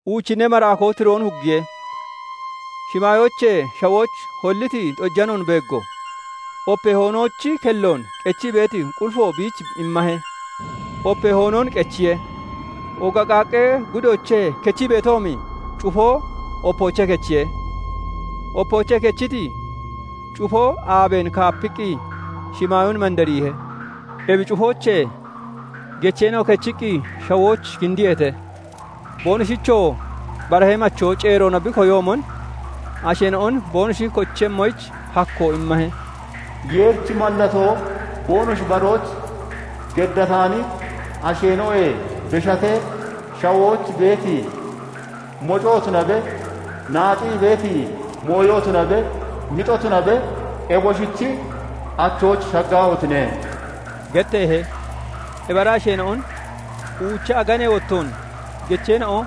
Uuchinnee maraakoo tiroon huggiye; shimaayoochee shawooch holliti xojanoon beeggo; opee hoonoochi kelloon qechii beeti qulifo biich immahe. Opee hoonoon qechiye; ooga qaaqqee gudoochee kechii beetoomi cufoo opoochee kechiye; opoochee kechiti cufoo aabeen kaapiqqi shimaayoon mandariihe. Ebi cufoochee gecheena'o kechiqqi shawooch kindiyeete; boonoshichoo barahee machoo ceeroona bi koyoomon asheena'on boonoshi kochemmoyich hakkoo immahe; "Yeerichi mallatoo boonoshi barooch geddataani asheena'oyee beshatee, shawooch beeti mocoo tunabe, naaxii (nocii) beeti mooyo tunabe, mixo tunabe, eboshichi achooch shaggaahotine!" getteehe. Ebi ara asheena'on uucha aganee wottoon gecheena'o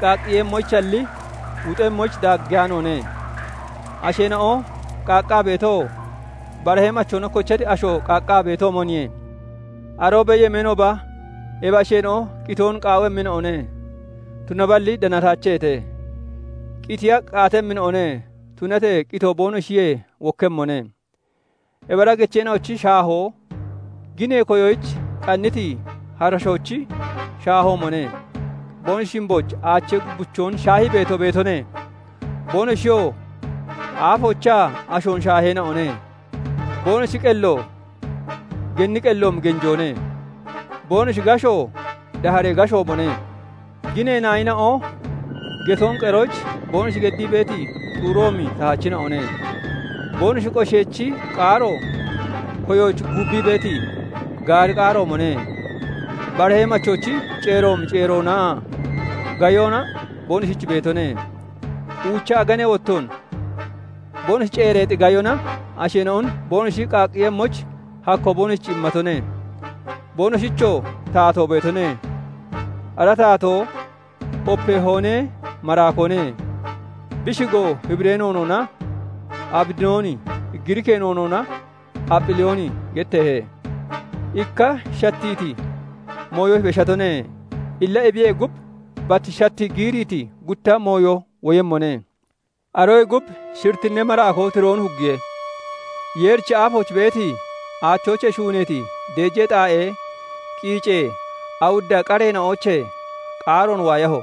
qaaqqiyemmoyichalli, wuxemmoyich daaggeyaanoone; asheena'o qaaqqaa beetoo barahee machoona kochati asho qaaqqaa beetoomoniye. Aroobee yemeenooba ebi asheena'o qitoon qaawemmina'one; tunaballi danataacheete; qitiya qaatemmina'one; tunatee qitoo boonoshiyee wokkemmone. Ebi ara gecheena'ochi shaahoo ginee koyoyich qanniti harashoochi shaahoomone; boonoshi shimbooch aachee gubbichoon shaahii beeto beetone; boonoshiyoo aafoochaa ashoon shaaheena'one; boonoshi qello genni qelloomi genjoone; boonoshi gashoo daaharee gashoomone; Ginee naayina'o getoon qeroyich boonoshi geddii beeti xuuroomi tahachina'one; boonoshi qosheechi qaaro koyooch guubbii beeti, gaari qaaroomone. Barahee machoochi ceeroomi ceeroonaa gayona boonoshich beetone; uucha aganee wottoon boonoshi ceereexi gayona asheena'on boonoshi qaaqqiiyemmoyich hakkoo boonoshich immatone. Boonoshichoo taatoo beetone; ara taatoo opee hoonee maraakoone; bi shigoo Hibiree noonoona Abidooni, Giriikee noonoona Apholiyooni getteehe. Ikka shattiiti mooyo beshatone; illa ebiyee gub bat shattii giiriiti gutta mooyo woyemmone. Aroyee gub shirittinnee maraakoo tiroon huggiye; Yeerichi aafooch beeti, aachoochee shuuneeti deejee xaa'ee qiicee awudda qareena'oochee qaaroon waayaho.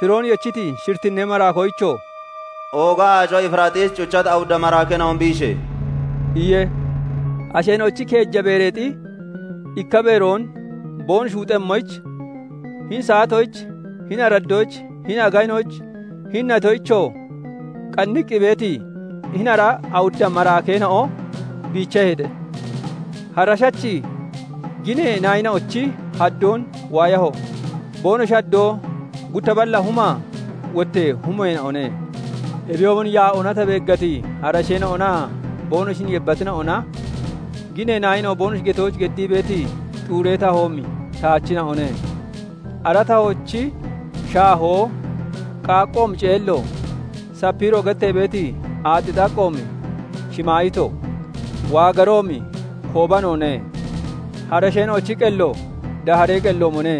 tiroon yechiti shirittinnee maraakoyichoo "Ooga aaco Efiraaxiis cuchati awudda maraakeena'on biishe!" iye. Asheena'ochi keeja beereexi ikka beeroon boonoshi wuxemmoyich, hini saatoyich, hini araddoyich, hini aganoyich, hini natoyichoo qanniqqi beeti hini ara awudda maraakeena'o biichaheete. Harashachi ginee naayina'ochi haddoon waayaho; boonoshi haddoo gutta balla huma wottee humeena'one. Ebiyoomon yaa'oona ta beeggati harasheena'onaa boonoshin yebbatina'ona ginee naayina'o boonoshi getooch geddii beeti xuuree tahoomi tahachina'one; ara tahoochi shaahoo qaaqqoomi ceello, sapiiro gettee beeti aaxxi xaqqoomi shimaayito, waagaroomi koobanoone; harasheena'ochi qello daaharee qelloomone;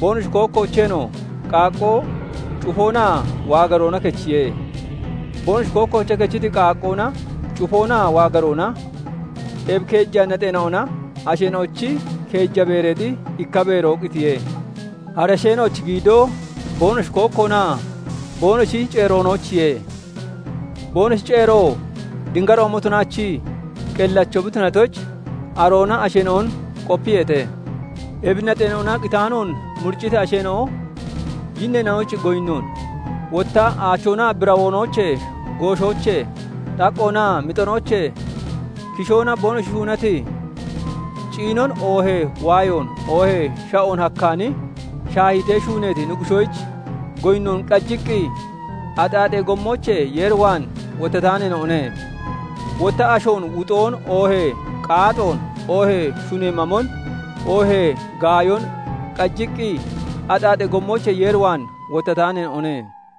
boonoshi kookkoocheenoo qaaqqoo, cufoonaa waagaroona kechiye. Boonoshi kookkoochee kechiti qaaqqoona, cufoonaa waagaroona, ebi keeja naxeena'ona asheena'ochi keeja beereexi ikka beeroo qitiye. Harasheena'ochi giidoo boonoshi kookkoonaa boonoshi ceeroonoochiye; boonoshi ceeroo dingaroomo tunaachii qellacho bi tunatoyich aroona asheena'on qopiyeete. Ebi naxeena'ona qitaanoon muricciti asheena'o yinneena'oyich goyinnoon, wotta aachoonaa birawoonoochee, gooshoochee, xaqqoonaa mixonoochee kishoona boonoshi shuunati, ciinon oohee waayoon, oohee sha'oon hakkaani, shaahiitee shuuneeti nuggushoyich goyinnoon qajiqqi axaaxee gommoochee Yeer waan wottataaneena'one; wotta ashoon wuxoon, oohee iicoon (qaaxoon), oohee shunee mamon, oohee gaayon qajiqqi axaaxee gommoochee Yeer waan wottataaneena'one.